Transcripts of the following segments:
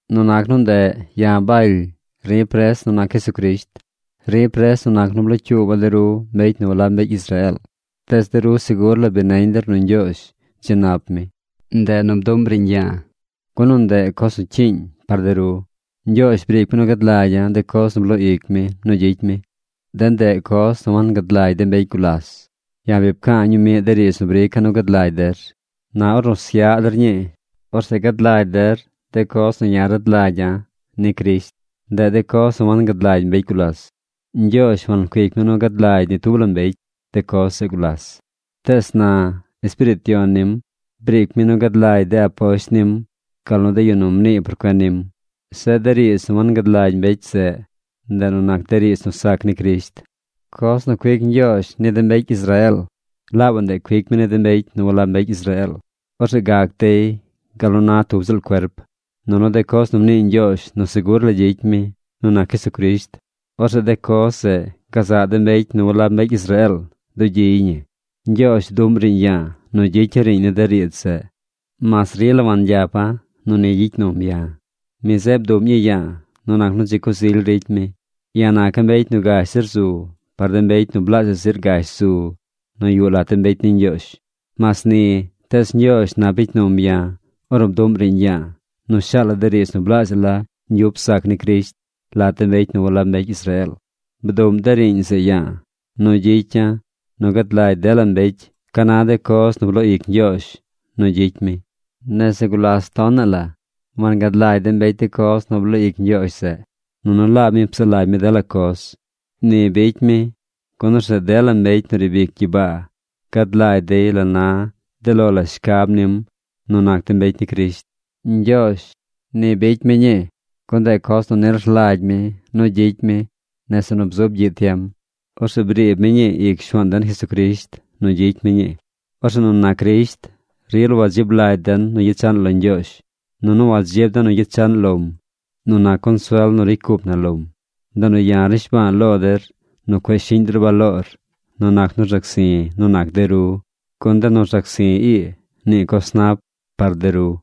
Nu nac nu ndeꞌ, ya̱ Baly, ri̱ pres nu nac Jesucrisht. Ri̱ pres nu nac nu blocyuuba̱ de ru mbecy nu walab mbecy Israeel. Tees de ru segur la bi neñ der nu Ñgyoozh dzi nap mi. Ndeꞌ nu bduꞌm riiñ ya̱a̱, gun nu ndeꞌ coz nu cyiiñ par de ru. Ñgyoozh briic mi nu gad lagya̱ de coz nu bloo ic mi nu gyicy mi. De ndeꞌ coz nu wangad lagy de mbecy gulas. Ya̱ bi pca̱a̱ ñumiꞌ de riidz nu brica̱ nu gad lagy der. Na ornu syaꞌ der ñii, orzeꞌ gad lagy der de coz nu ya̱ rad lagya̱ ni Crisht. Ndeꞌ de coz nu wangad lagy mbecy gulas. Ñgyoozh wancuic mi nu gad lagy ni tub la mbecy de coz zeꞌ gulas, tees na Espiriit Yon nim briic mi nu gad lagy de aposht nim gal nu de yu nu mnii por cuen nim. Zeꞌ de riidz nu wangad lagy mbecy zeꞌ, ndeꞌ nu nac de riidz nu sac ni Crisht, coz nu cuic Ñgyoozh ni de mbecy Israeel, laabaꞌ ndeꞌ cuic mi ni de mbecy nu walab mbecy Israeel. Orzeꞌ gac dey gal nu na tub ziꞌl cuerp. Nunu de coz nu mnii Ñgyoozh nu segur la gyicy mi nu nac Jesucrisht, orzeꞌ de coz zeꞌ gazaꞌ de mbecy nu walab mbecy Israeel dugyiy ñi. Ñgyoozh bduꞌm riiñ ya̱a̱ nu gyicya̱ riiñ ni de riidz zeꞌ mas rila wangyapa̱ nu ni gyicy num ya̱. Mi zeꞌ bduꞌm ñii ya̱a̱ nu nac nu dzi coz ily ricy mi. Ya̱ naca̱ mbecy nu gash zir zu par de mbecy nu blaazhaꞌ zir gash zu nu yuꞌ lat de mbecy ni Ñgyoozh. Mas ni, tees Ñgyoozh nap bicy num ya̱ ornu bduꞌm riiñ ya̱a̱ nu shaala̱ de riidz nu blaazhaꞌ la ñgyup sac ni Crisht lat de mbecy nu walab mbecy Israeel. Bduꞌm de riiñ zeꞌ ya̱a̱ nu gyicya̱ nu gad lagy dela mbecy ca na de coz nu bloo ic Ñgyoozh nu gyicy mi. Nese gulas tonaꞌ la wangad lagy de mbecy de coz nu bloo ic Ñgyoozh zeꞌ. Nunu laab mi psaꞌ lagy mi dela coz. Ni bicy mi, gun orzeꞌ dela mbecy nu riib ic gyibaa gad lagy dey la na de lo la shcab nim nu nac de mbecy ni Crisht. Ñgyoozh, ni bicy mi ñii, gun ndeꞌ coz nu nil rlagy mi nu gyicy mi nese nu bzub gyiꞌ tiem. Orzeꞌ briib mi ñii ic Shuaan den Jesucrisht nu gyicy mi ñii. Orzeꞌ nu nac Crisht rila wadzib lagy den nu gyechaꞌn lo Ñgyoozh. Nunu wadzib den nu gyechaꞌn lom nu nac consuel nu ricy cup na lom. Ndeꞌ nu ya̱ rnishba̱a̱ lo der nu cueꞌ shiꞌñ der baloor nu nac nu rzac zi̱ nu nac de ru, gun de nu rzac zi̱ ii, nii coz nap par de ru.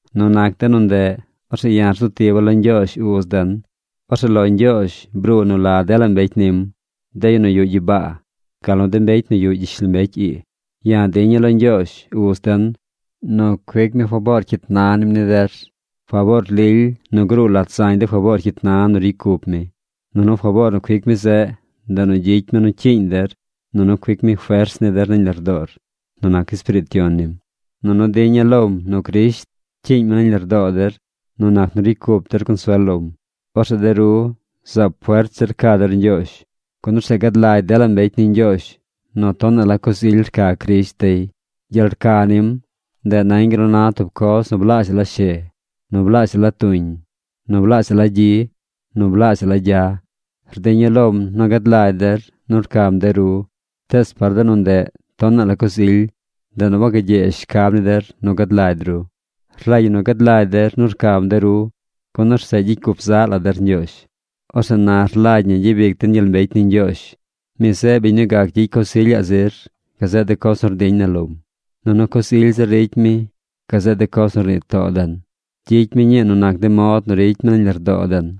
Nu nac de nu ndeꞌ, orzeꞌ ya̱ rzu tiba̱ lo Ñgyoozh Uz den. Orzeꞌ lo Ñgyoozh bruu nu la dela de mbecy nim: de yu nu yuꞌ gyibaa, gal nu de mbecy nu yuꞌ gyishlombecy ii. Ya̱ diña̱ lo Ñgyoozh, Uz den, nu cuic mi faboor cyit na nim ni der, faboor lily nu gruu lat zañ de faboor cyit na nu ricy cup mi. Nunu faboor nu cuic mi zeꞌ, ndeꞌ nu gyicy mi nu cyiiñ der, nunu cuic mi fers ni der nañ lardoor nu nac Espiriit Yon nim. Nunu diña̱ lom nu Crisht cyiiñ mi nañ lardoo der nu nac nu ricy cup der consuel lom. Orzeꞌ de ru zaab fert zir ca der Ñgyoozh. Gun orzeꞌ gad lagy dela mbecy ni Ñgyoozh nu tonaꞌ la coz ily rca Crisht dey. Gyel rca nim, ndeꞌ nañ gal nu na tub coz nu blaazhaꞌ la she, nu blaazhaꞌ la tuñ, nu blaazhaꞌ la gyi, nu blaazhaꞌ la gya. Rdiña̱ lom nu gad lagy der nu rcam de ru. Tees par de nu ndeꞌ tonaꞌ la coz ily, ndeꞌ nu wagagyee shcab ni der nu gad lagy ru. Rlagy ñi nu gad lagy der nu rcam de ru, gun orzeꞌ gyicy cup zaꞌ la der Ñgyoozh. Orzeꞌ na rlagy ñi gyabic den gyel mbecy ni Ñgyoozh. Mi zeꞌ biñ nu gac gyicy coz ilyaꞌ zir gazeꞌ de coz nu rdiñ na lom, nunu coz ily zir ricy mi gazeꞌ de coz nu rnii too den. Gyicy mi ñii nu nac de mod nu ricy mi nañ lardoo den.